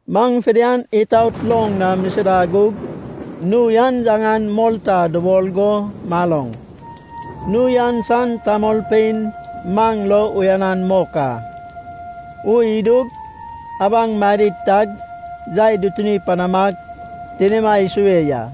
Maŋ fidian itaot loŋ na misida gug nui an yaŋan Molta dubol go maloŋ. Nui an san tamolpein maŋ lo uyanan mok a. Ui idug abaŋ madid tag yai dutuni panamag, tinima isue ya.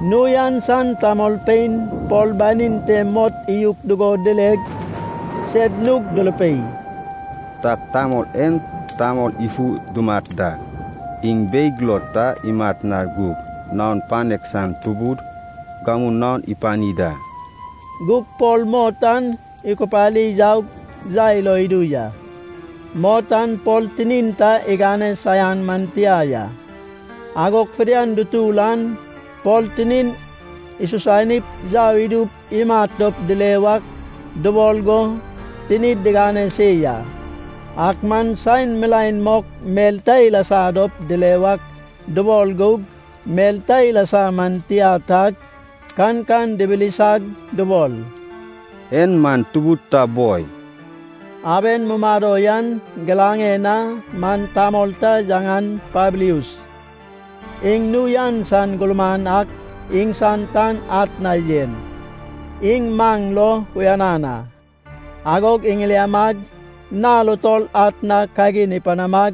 Nui an san tamolpein Pol banin te mot iyuk dugo dileg, sed nug durupei, “Tag tamol en tamol ifu dumat da. Iŋ beig lo ta imat na gug, naon panek san tubud gamu naon ipani da.” Gug Pol mot an ikupari yaug yai lo idu ya. Mot an Pol tinin ta igane saian man tia ya. Agog fidian dutur an Pol tinin isusanip yau idup imat dop dile wak dubol go tinid digane se ya. Ak man saen milaen mok mel ta ilasa dop dile wak dubol gug, mel ta ilasa man tia tag, kankan dibilisag dubol, “En man tubud ta boi.” Aben mumado yan giraŋen na man tamol ta yaŋan Pablius iŋ nui an san gurman ak iŋsan tan atna yen. Iŋ maŋ lo uyanan a. Agog iŋiliamag nal utol atna kagin ipanamag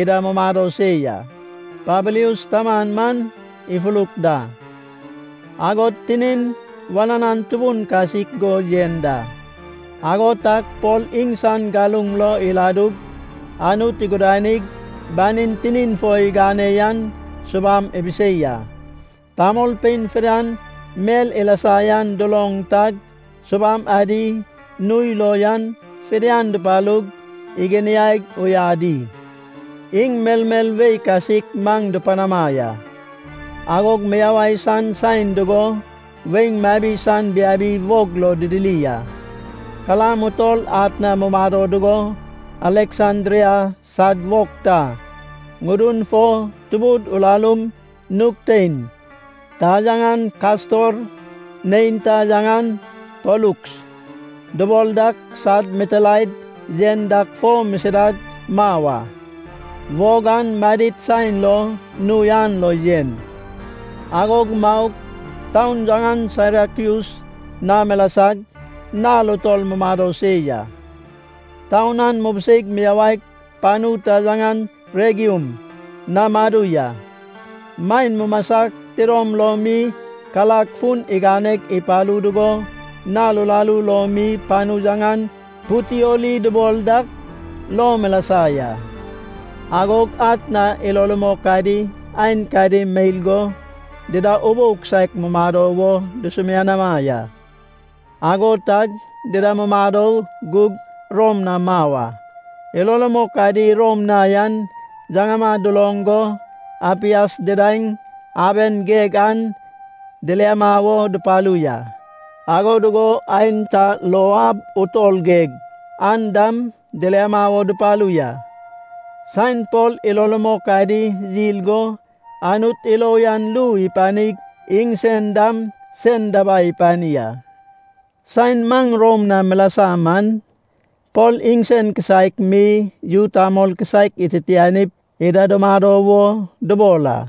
ida mumado se ya. Pablius taman man ifuruk da, agod tinin wananan tubun kasik go yen da. Ago tag Pol iŋsan galuŋ lo iladug Anut igudanig, banin tinin fo igane yan subam ibisei a. Tamolpein fidian mel ilasa yan duloŋ tag, subam adi nui lo yan fidian dupalug iginiaig uyadi. Iŋ melmel wei kasik maŋ dupanama ya. Agog miyawai san saen dugo weiŋ mabi san biabi wog lo didiri a. Kalam utol atna mumado dugo Aleksandria sad wog ta ŋudun fo tubud urarum nug tein, ta yaŋan Kastor, neinta yaŋan Poluks dubol dak sad mitilaed yen dak fo misidag mau a. Wog an madid saen lo nui an lo yen. Agog maug, taun yaŋan Sairakyus na milasag, nal utol mumado se ya. Taun an mubiseig miyawaig, panu ta yaŋan Regium na madu ya. Maen mumasag tidom lom mi karag fun iganeg ipalu dugo, nal uraru lo mi panu yaŋan Putioli dubol dak lo milasa ya. Agog atna ilo rumok adi aenkadi meil go dida ubou kisaek mumado wo dusumianama ya. Ago tag dida mumado gug Rom na mau a. Ilo rumok adi Rom na yan yaŋama duloŋ go Apias Didaeŋ Aben geg an diliama wo dupalu ya. Ago dugo aenta Lou Ab Utol geg an dam diliama wo dupalu ya. Saen Pol ilo rumok adi yil go Anut ilo uyan ru ipanig, iŋsen dam sen dabai ipani a. Saen maŋ Rom na milasa man, Pol iŋsen kisaek mi, yu tamol kisaek ititianip ida dumado wo dubol a.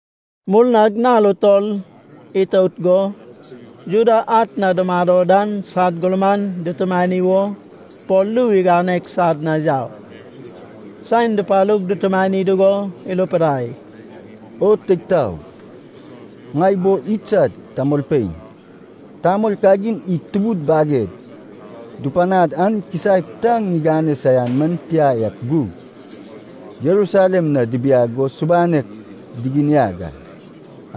Murnag nal utol itout go Juda atna dumado dan sad gurman dutumani wo Pol ru iganeg sad na yau. Saen dupalug dutumani dugo irupidai, “O teig taog, ŋai bo idsad tamolpein, tamol kagin id tubud baged dupanad an kisaek ta ŋigane saian man tia ak gug, Jerusalem na dibiag go subanek diginiag a.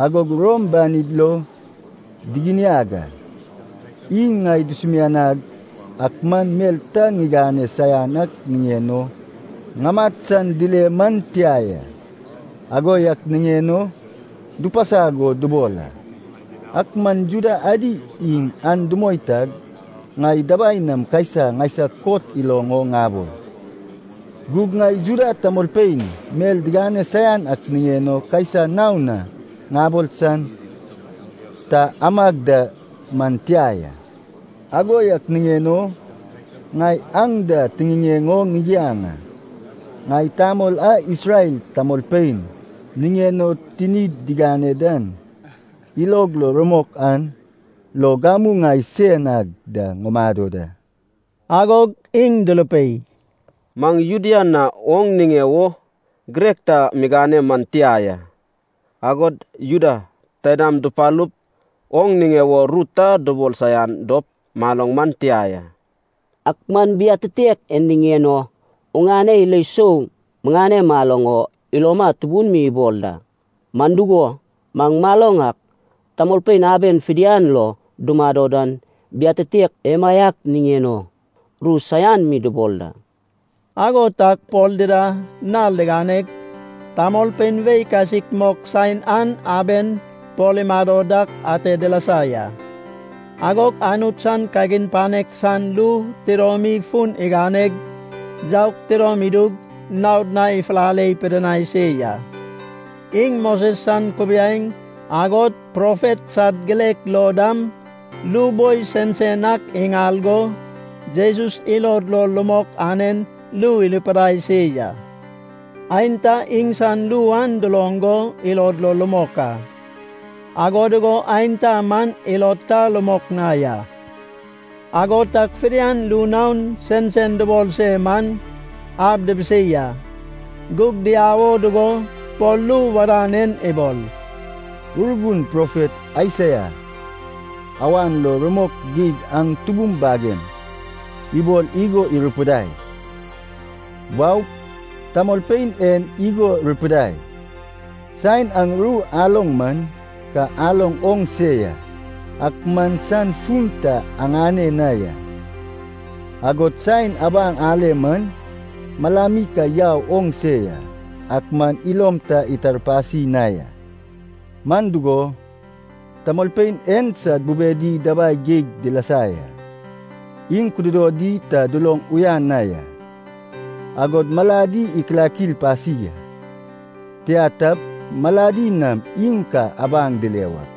Agog Rom banid lo diginiag a. Iŋ ŋai dusumianag ak man mel ta ŋigane saian ak niŋen o ŋamat san dile man tia ya. Ago yak niŋen o dupasag o dubol a. Ak man Juda adi iŋ an dumoi tag, ŋai dabai nam Kaisa ŋaisag kot iloŋ o ŋabol. Gug ŋai Juda tamolpein mel digane saian ak niŋen o Kaisa naon na ŋabol san ta amag da man tia ya. Ago yak niŋen o ŋai aŋ da tiŋiŋeŋ o ŋigiaŋ a. Ŋai tamol a Isrel tamolpein niŋen o tinid digane dan ilog lo rumok an lo gamu ŋai sein ag da ŋumado da.” Agog iŋ durupei, “Maŋ Judea na oŋ niŋe wo girek ta miŋane man tia ya. Agod Juda taidam dupalup oŋ niŋe wo ru ta dubol saian dop maloŋ man tia ya. Ak man biatitek en niŋen o oŋane ilo sou miŋane maloŋ o iloma tubun mi ibol da. Man dugo, maŋ maloŋ ak, tamolpein aben fidian lo dumado dan biatitek emaiak niŋen o ru saian mi dubol da.” Ago tag Pol dida nal diganeg tamolpein wei kasik mok saen an aben Pol imado dak ate dilasa ya. Agog Anut san kagin panek san ru tidomi fun iganeg yaug, tidom idug naod na ifulale pidinai se ya. Iŋ Moses san kubiaeŋ, agod profet sad girek lo dam ru boi sensen ak iŋal go, Jesus ilod lo rumok anen ru irupidai se ya. Aenta iŋsan ru an duloŋ go ilod lo rumok a, ago dugo aenta man ilod ta rumok na ya. Ago tag fidian ru naon sensen dubol se man ab dibisei a. Gug diau o dugo Pol ru wadan en ibol, “Urgun profet Aisaia awan lo rumok geig aŋ tubum bagem ibol igo irupidai, ‘Waup, tamolpein en igo rupidai: Saen aŋ ru aloŋ man, ka aloŋ oŋ se ya, ak man san fun ta aŋane na ya, agod saen abaŋ ale man, malami ka yau oŋ se ya, ak man ilom ta itarpasi na ya. Man dugo, tamolpein en sad bubedi dabai geig dilasa ya, iŋ kududodi ta duloŋ uyan na ya, agod maladi ikilakil pasi a. Tia tap, maladi nam iŋ ka abaŋ dile wak,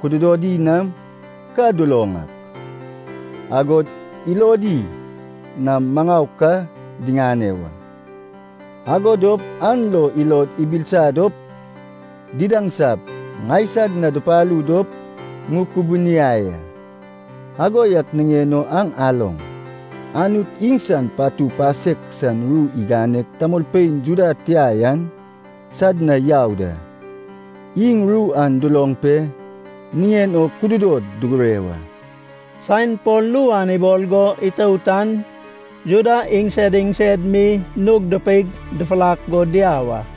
kududodi nam ka duloŋ ak, agod ilodi nam maŋau ka diŋane wa. Ago dop an lo ilod ibilisa dop didaŋsap ŋaisag na dupalu dop ŋukubuniai a.’” “Ago yak niŋen o aŋ aloŋ. Anut iŋsan patu pasek san ru iganeg tamolpein Juda tia yan sad na yau da. Iŋ ru an duloŋ pe niŋen o kududod dugure wa!” [Saen Pol ru an ibol go itout an Juda iŋsed iŋsed mi nug dupeig dufurak go diau a.]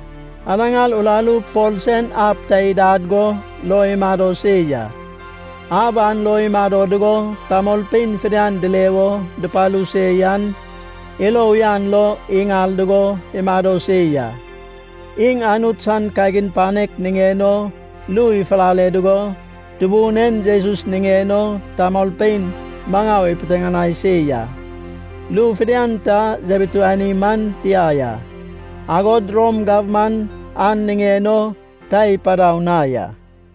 Anaŋar uraru Pol sen ab ta idad go lo imado se ya. Ab an lo imado dugo tamolpein fidian dile wo dupalu se yan ilo uyan lo iŋal dugo imado se ya. Iŋ Anut san kagin panek niŋen o ru ifulale dugo, Tubun en Jesus niŋen o tamolpein maŋau ipiteŋanai se ya. Ru fidian ta yabituani man tia ya. Agod Rom gabman an niŋen o ta ipadau na ya.